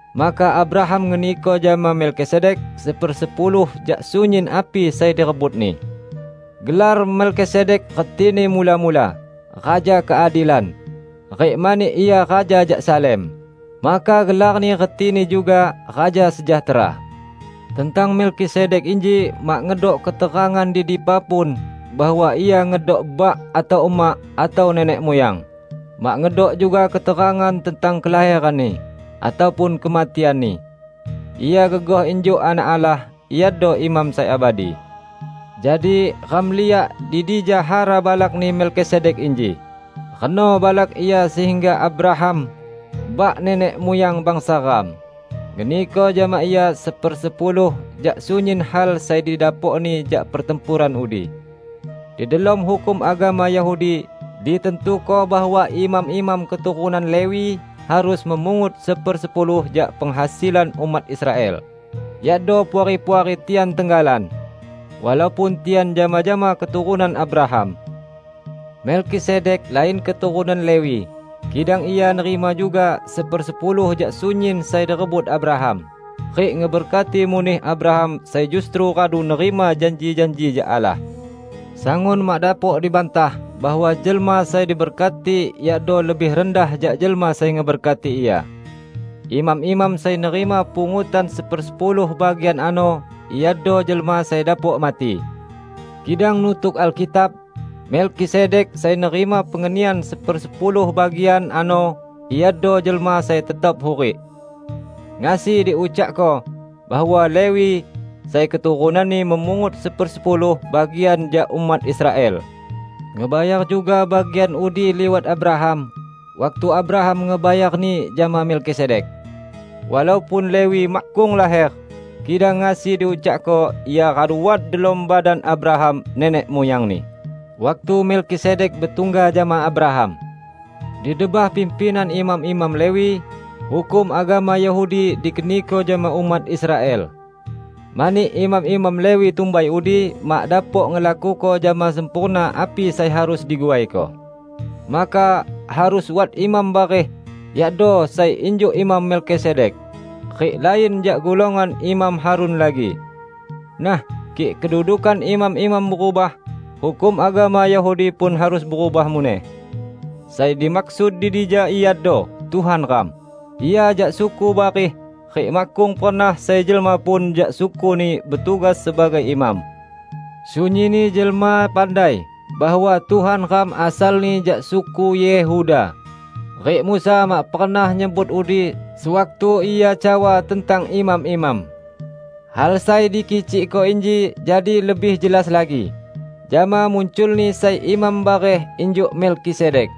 Maka Abraham ngeniko jama Melkisedek sepersepuluh jak sunyin api sai direbutni. (Gelar Melkisedek retini, mula-mula, "Raja Keadilan"; rik mani ia raja jak Salem, maka gelarni retini juga "Raja Sejahtera".) Tentang Melkisedek inji mak ngedok keterangan di dipa pun bahwa ia ngedok bak atau emak atau nenek muyang; mak ngedok juga keterangan tentang kelaheranni, ataupun kematianni. Ia gegoh injuk Anak Allah; iado imam sai abadi. Jadi, ram liak di dija hara balakni Melkisedek inji; reno balak ia sehingga Abraham, bak nenek muyang bangsa ram, ngeniko jama ia sepersepuluh jak sunyin hal sai didapokni jak pertempuran udi. Di delom hukum agama Yahudi ditantuko bahwa imam-imam keturunan Lewi harus memungut sepersepuluh jak penghasilan umat Israel, yakdo puari-puari tian tenggalan, walaupun tian jama-jama keturunan Abraham. Melkisedek lain keturunan Lewi, kidang ia nerima juga sepersepuluh jak sunyin sai direbut Abraham, rik ngeberkati muneh Abraham sai justru radu nerima janji-janji jak Allah. Sangun mak dapok dibantah bahwa jelma sai diberkati yakdo lebih rendah jak jelma sai ngeberkati ia. Imam-imam sai nerima pungutan sepersepuluh bagian ano iado jelma sai dapok mati. Kidang nutuk Alkitab, Melkisedek sai nerima pengenian sepersepuluh bagian ano iado jelma sai tetap hurik. Ngasi diucakko, bahwa Lewi -- sai keturunanni memungut sepersepuluh bagian jak umat Israel -- ngebayar juga bagian udi liwat Abraham, waktu Abraham ngebayarni jama Melkisedek. Walaupun Lewi makkung laher, kidang ngasi diucakko ia radu wat delom badan Abraham nenek muyangni, waktu Melkisedek betungga jama Abraham. Di debah pimpinan imam-imam Lewi, hukum agama Yahudi dikeniko jama umat Israel. Mani imam-imam Lewi tumbai udi mak dapok ngelakuko jama sempurna api sai harus diguaiko, maka harus wat imam bareh, yakdo sai injuk Imam Melkisedek, rik lain jak golongan Imam Harun lagi! Nah, kik kedudukan imam-imam berubah, hukum agama Yahudi pun harus berubah muneh. Sai dimaksud di dija iado Tuhan ram: Ia jak suku bareh rik makkung pernah sai jelma pun jak suku-Ni betugas sebagai imam. Sunyinni jelma pandai bahwa Tuhan ram asalni jak suku Yehuda; rik Musa mak pernah nyebut udi sewaktu ia cawa tentang imam-imam. Hal sai dikicikko inji jadi lebih jelas lagi, jama munculni sai imam bareh injuk Melkisedek.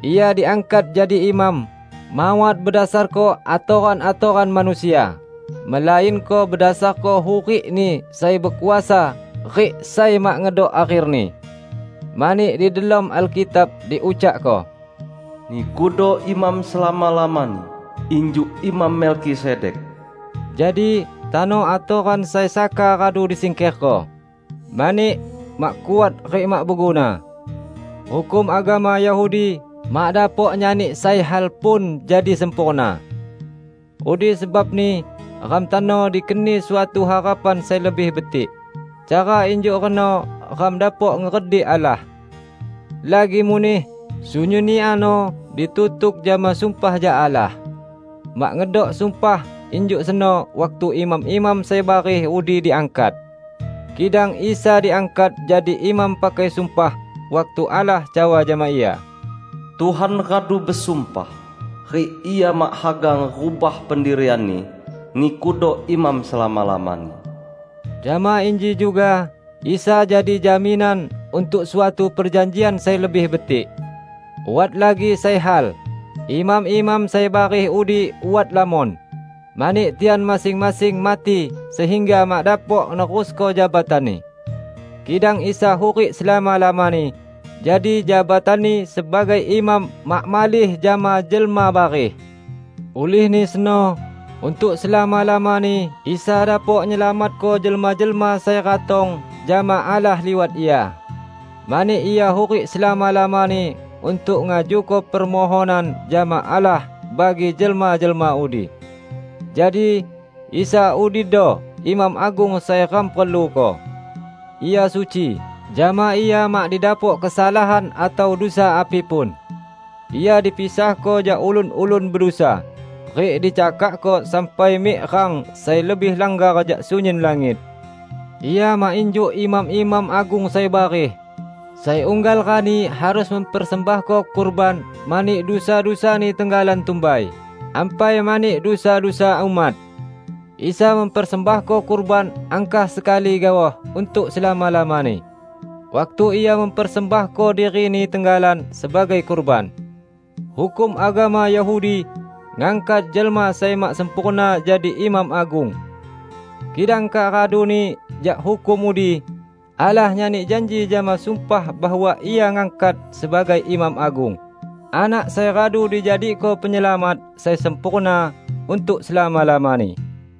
Ia diangkat jadi imam, mawat bedasarko atoran-atoran manusia, melainko bedasarko hurik-Ni sai bekuasa rik sai mak ngedok akherni. Mani di delom Alkitab diucakko, "Nikudo imam selama-lamani, injuk Imam Melkisedek." Jadi, tano atoran sai saka radu disingkerko, mani mak kuat rik mak beguna. Hukum agama Yahudi mak dapok nyani sai hal pun jadi sempurna. Udi sebabni ram tano dikeni suatu harapan sai lebih betik; cara injuk reno ram dapok ngeredik Allah. Lagi muneh, sunyinni ano ditutuk jama sumpah jak Allah. Mak ngedok sumpah injuk seno waktu imam-imam sai bareh udi diangkat. Kidang Isa diangkat jadi imam pakai sumpah, waktu Allah cawa jama Ia, "Tuhan radu besumpah, rik Ia mak haga ngerubah pendirian-Ni, 'Nikudo imam selama-lamani.' " Jama inji juga Isa jadi jaminan untuk suatu perjanjian sai lebih betik. Wat lagi sai hal: imam-imam sai bareh udi wat lamon, mani tian masing-masing mati sehingga mak dapok nerusko jabatanni. Kidang Isa hurik selama-lamani, jadi jabatan-Ni sebagai imam mak malih jama jelma bareh. Ulihni seno untuk selama-lamani Isa dapok nyelamatko jelma-jelma sai ratong jama Allah liwat Ia, mani Ia hurik selama-lamani untuk ngajuko permohonan jama Allah bagi jelma-jelma udi. Jadi, Isa udido Imam Agung sai ram perluko. Ia suci; jama Ia mak didapok kesalahan atau dusa api pun. Ia dipisahko jak ulun-ulun bedusa, rik dicakakko sampai mik rang sai lebih langgar jak sunyin langit. Ia mak injuk imam-imam agung sai bareh, sai unggal rani harus mempersembahko kurban mani dusa-dusani tenggalan tumbai, ampai mani dusa-dusa umat. Isa mempersembahko kurban angkah sekali gaoh untuk selama-lamani, waktu Ia mempersembahko diri-Ni tenggalan sebagai kurban. Hukum agama Yahudi ngangkat jelma sai mak sempurna jadi imam agung. Kidang kak raduni jak hukum udi, Allah nyani janji jama sumpah bahwa Ia ngangkat sebagai Imam Agung, Anak sai radu dijadiko Penyelamat sai sempurna untuk selama-lamani.